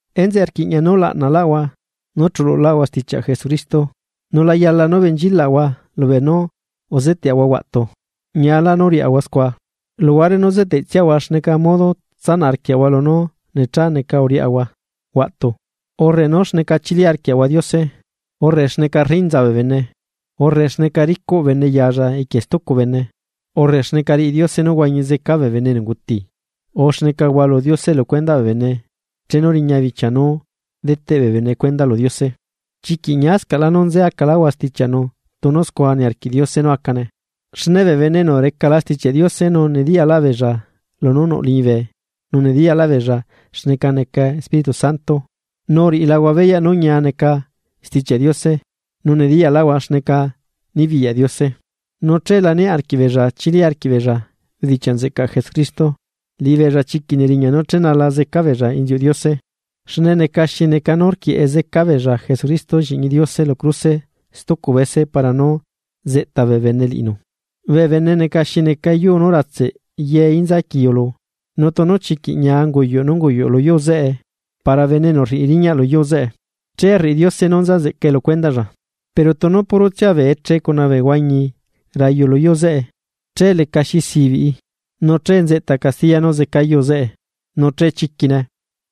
Enzeꞌe rquiꞌña nú laꞌnaꞌlaꞌahua nú chululaꞌahua stichiaꞌ Jesucristo nu la yala nú benchilaꞌahua lubeenú uzeteꞌahua huaꞌtu. Ñialá nú riaꞌahua scua, luhuare nú zeteꞌtsiahua xneca modo tsanaꞌ arquiaꞌahua lunú necha neca uriaꞌahua huaꞌtu, urre nú xneca chili arquiaꞌahua Diose, urre xneca rinza bee bene, urre xneca ricuꞌ bene yalla equie stucu bene, urre xneca riꞌi Diose nú huañi zeca bee bene enu unguti, urre xneca hualu Diose lu cuendaꞌ bee bene chenu riña bichia nú deteꞌ bee bene cuenda lu Diose. Chiquiꞌ ñiascaꞌlá nú nze acaꞌláꞌahua stichiaꞌnu tunu scua niarquiꞌ Diose nú acane. Xne bee bene enu recala Stichiaꞌ Diose nu nediyaꞌlaꞌ lunú nuꞌ liñibe, nu nediyaꞌlaꞌ beella xneca neca Espíritu Santo, nu uriꞌilahua beyaꞌ nú ñia neca Stichiaꞌ Diose nu nediyaꞌlaꞌhua xneca nibiyaꞌ Diose, nu che la niaꞌ arquiꞌbeella chili arquiꞌbeella bedichiaꞌ nzeꞌcaꞌ Jesucristo, liꞌibeella chiquiꞌ neriñaꞌ nú chenala zeca beella inziuꞌ Diose, xne neca xi neca nú rquieꞌe zeca beella Jesucristo lliꞌñi Diose lu cruse stucu bese para nú zeꞌta bee bene liꞌinu. Bee bene neca xi neca yuu nú ratse ye inza quiu lu, nu tunu chiquiꞌ ñia unguyuꞌ nú unguyuꞌ lu yuu zeꞌe para bene enu rriꞌi riñaꞌ lu yuu zeꞌe che rriꞌi Diose nú nza nzeꞌcae lu cuendaꞌlla. Pero tunu purotsia bee eche cuna bee huañi rayu lu yuu zeꞌe, che lecaxi sibiꞌi, nu che nzeꞌta castiya nú zeca yuu zeꞌe, nu che chiquine.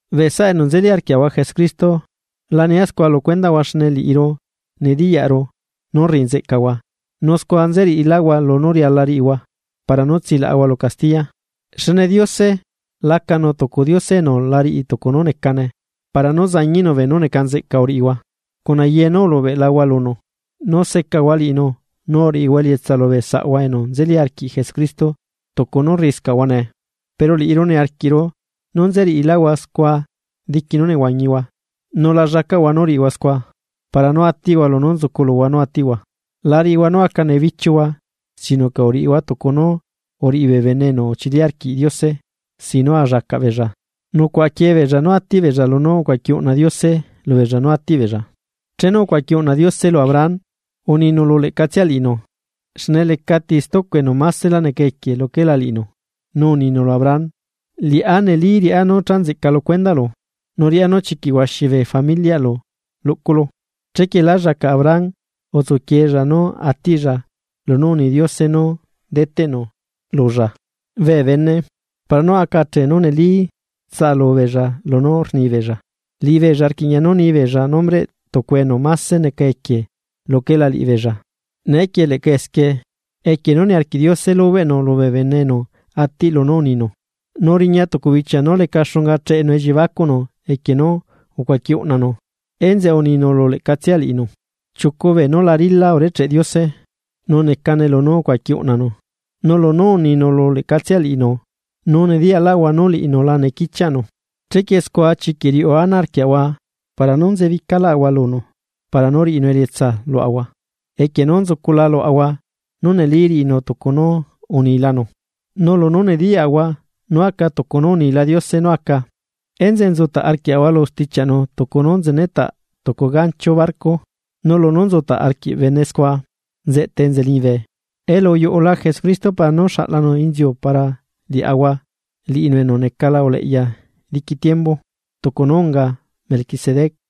Bee saꞌa enu nzeli arquiaꞌahua Jesucristo, la nia scua lu cuendaꞌhua xne liꞌiru nediyaꞌru nú rriꞌi nzeꞌcahua, nu scua nzeriꞌiláhua lunu riala riꞌihua para nú tsilaꞌahua lu castiya. Xne Diose, lacanu tucu Diose enu la riꞌi tucu nú necane para nú zañiꞌnu beenú neca nzeꞌca uriꞌihua cuna ye nú ulubeꞌlahua lunu, nu secahua liꞌinu nu uriꞌihua elietsa lubee saꞌahua enu nzeli arquiꞌ Jesucristo tucu nú rriꞌiscaꞌhua nee. Pero liꞌiru niarquiꞌru nú nzeriꞌiláhua scua diqui nú nehuañihua. Nu la llacaꞌhua nú riꞌihua scua, para nú atiꞌhua lunú nzucu luhua nú atiꞌhua. La riꞌihua nú aca nebichiuhua sino que uriꞌihua tucu nú uriꞌi bee bene enu uchili arquiꞌ Diose sin nú allacaꞌ beella nucuaꞌa quiebeella nú atiꞌ beella lunú ucuaquiꞌ uꞌna Diose lubeella nú atiꞌ beella. Chenu ucuaqui uꞌna Diose lu Abraham, uninu lu leꞌcatsia liꞌinu xne lecati stucu enu masela neca equie luquela liꞌinu, nu uninu lu Abraham: “Liꞌá neli riꞌá nú cha nzeꞌca lu cuendaꞌlu nu riꞌá nú chiquiꞌ huaxi bee familiaꞌlu luꞌculu.” Chequie lá llacaꞌ Abraham utsuquiella nú atiꞌlla lunú uni Diose nú deteꞌnu lulla. Bee bene, para nú aca achee nú neli tsaꞌalubeella lunú rnibeella, liꞌibeella rquiꞌña nú nibeella nombreꞌ tucu enu máse neca equie luquela liꞌibeella. Neequie leꞌca esquie, equie nú niarquiꞌ Diose lubeꞌnu lubee bene enu atiꞌ lunú uninu, nu riña tucu bichia nú leca xunga cheꞌenu elliebacuꞌnu equie nú ucuaqui uꞌnanu, enzeꞌe uninu lu leꞌcatsia liꞌinu. Chiucu beenú la rila urecheꞌ Diose, nu necane lunú ucuaqui uꞌnanu, nu lunú uninu lu leꞌcatsia liꞌinu nu nediyaꞌlaꞌahua nú liꞌinu la nequichiaꞌnu. Chequie scua chiquiꞌ riuꞌu ana arquiaꞌahua para nú nzebicaꞌláꞌahua lunu para nú riꞌinu elietsa luaꞌahua, equie nú nzucula luaꞌahua nú neli riꞌinu tucu nú unilanu. Nu lunú nediyaꞌahua nú aca tucu nú unila Diose nú aca, enzeꞌe nzutaꞌ arquiaꞌahua lu stichiaꞌnu tucu nú nzenetaꞌ tucu gancho barco. Nu lunú nzutaꞌ arquiꞌ bene scua nzeꞌtae enza liñibe. Elu uyuꞌula Jesucristo para nú xaꞌlanu inziu para liaꞌahua, liꞌinu enu necala uleꞌya diqui tiembu, tucu nú unga Melquisedec.